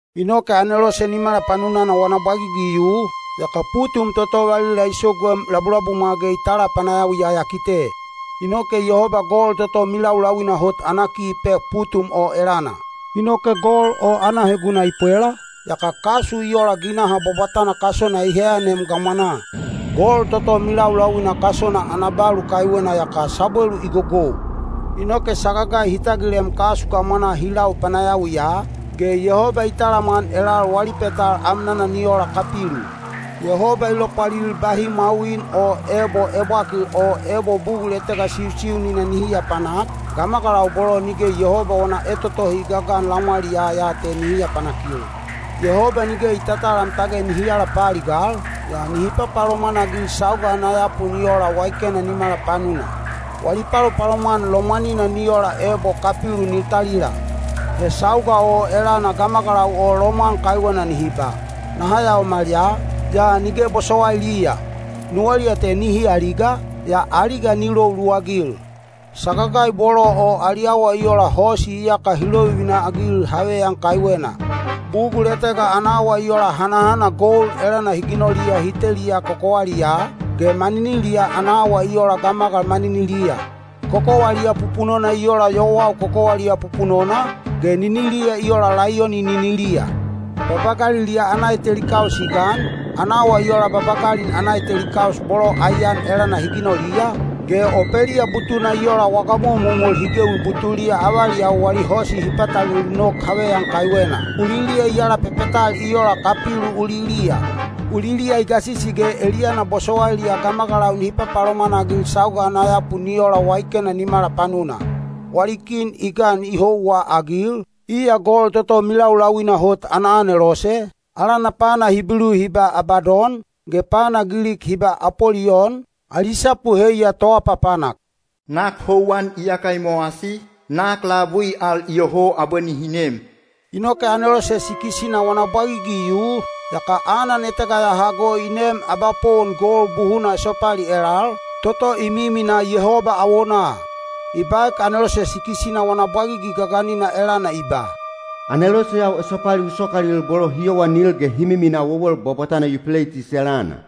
Inoke anelose nimala panunana wana bwagigi i yu, yaka putum toto valila i soguem labulabumwa ge i tala panayawiya ya kite. Inoke Yehoba gol toto milaulauina hot ana ki i pek putum o elana. Inoke gol o ana heguna i pwela, yaka kasu i ola ginaha bwabwatana kasona i heyanem gamwanaa. Gol toto milaulauina kasona ana balu kaiwena yaka sabwelu i gogou. Inoke sagagai hi tagilem kasu gamwanaa hi lau panayawiya, ge Yehoba i talamwan elal wali petal amnana ni ola kapilu. Yehoba i lopwalil bahi mwawin o ebo ebwakil o ebo bugul etega siusiunina nihi aapanak, gamagalau bolo nige Yehoba wana etotohi i gagan lamwaliyaa ya te nihi apanakil. Yehoba nige i tatalam tage nihi alapaaligal, yaa nihi papalomwan-agil sauga ana yapu ni ola waikena nimala panuna. Wali palopalomwan lomwanina ni ola ebo kapilu ni talila. He sauga o elana gamagalau o lomwan kaiwena nihi ba, “Naha yaomal ya,” yaa nige bosowailiya; nuwaliya te nihi aliga, yaa aliga ni lou luwagil. Sagagai bolo o ali awa i ola hosi iyaka hi lovivina-agil haveyan kaiwena. Bugul etega ana awa i ola hanahana gold elana hi ginoliya hi teliya kokowaliyaa, ge maniniliya ana awa i ola gamagal maniniliya. Kokowaliya pupunona i ola yowau kokowaliya pupunona, ge niniliya i ola laiyoni niniliya. Babagaliliya ana eteli kaus i gan, ana awa i ola babagalin ana eteli kaus bolo aiyan elana hi ginoliya, ge opeliya butuna i ola waga momomol hi gewi butuliya avaliyau wali hosi hi patalelu nok haveyan kaiwena. Uliliya i alapepetal i ola kapilu uliliya. Uliliya i gasisi ge eliyana bosowailiya gamagalau nihi papalomwan-agil sauga ana yapu ni ola waikena nimala panuna. Wali kin i gan i houwaagil, iya gol toto milaulauina hot ana anelose, alana pana Hibilu hi ba Abadon, ge pana Gilik hi ba Apoliyon, ali sapu heiya “Toapapanak.” Nak houwan iyaka i mowasi; nak labui al iyoho abwe nihi nem. Inoke anelose sikis-ina wana bwagigi i yu, yaka anan etega ya hago i neem abapowon gold buhuna esopali elal, toto i miminaa Yehoba awonaa. I baek anelose sikis-ina wana bwagigi gaganina elana i ba, “Aneloseyau esopali u sokalil bolo hi yowanil ge hi miminaa wewel bwabwatana Yupeleitis elana.”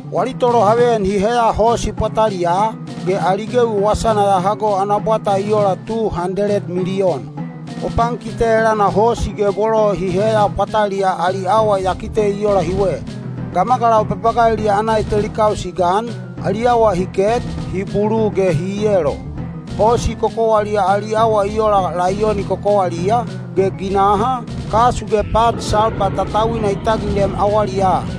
Wali tolohaveyan hi heya hosi pwataliyaa, ge ali gewi wasana ya hago ana bwata i ola tu handeled miliyon. O pankite elana hosi ge bolo hi heya pwataliyaa ali awa ya kite i ola hiwe. Gamagalau babagaliliya ana eteli kaus i gan, ali awa hi ket, hi bulu ge hi yelo. Hosi kokowaliya ali awa i ola laiyoni kokowaliya, ge ginaha, kasu ge pat salpa tatauina i tagilem awaliyaa.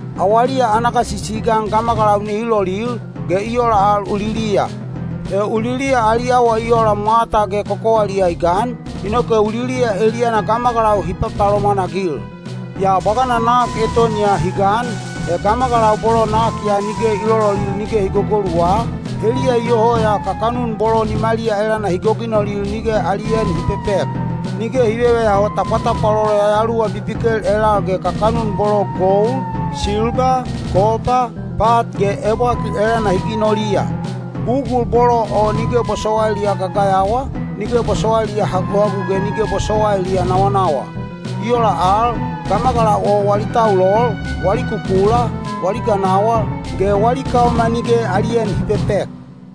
Awaliya ana gasisi i gan gamagalau nihi lolil, ge i ola al uliliya. He uliliya ali awa i ola mwata ge kokowaliya i gan, inoke uliliya eliyana gamagalau hi papalomwan-agil. Yaa bwagana nak eton ya hi gan, he gamagalau bolo nak ya nige i lololil nige hi gogoluwa, heliya iyoho ya kakanun bolo nimaliya elana hi goginolil nige ali en hi pepek. Nige hi veveyaho tapwatapwalolo yayaluwa bibikel elal ge kakanun bolo gold, silba, kopa, pat ge ebwakil elana hi ginoliya. Bugul bolo o nige bosowailiya gagayawa, nige bosowailiya haguhagu ge nige bosowailiya nawanawa. I ola al, gamagalau o wali taulol, wali kukula, wali ganawal, ge wali kaoma nige ali en hi pepek.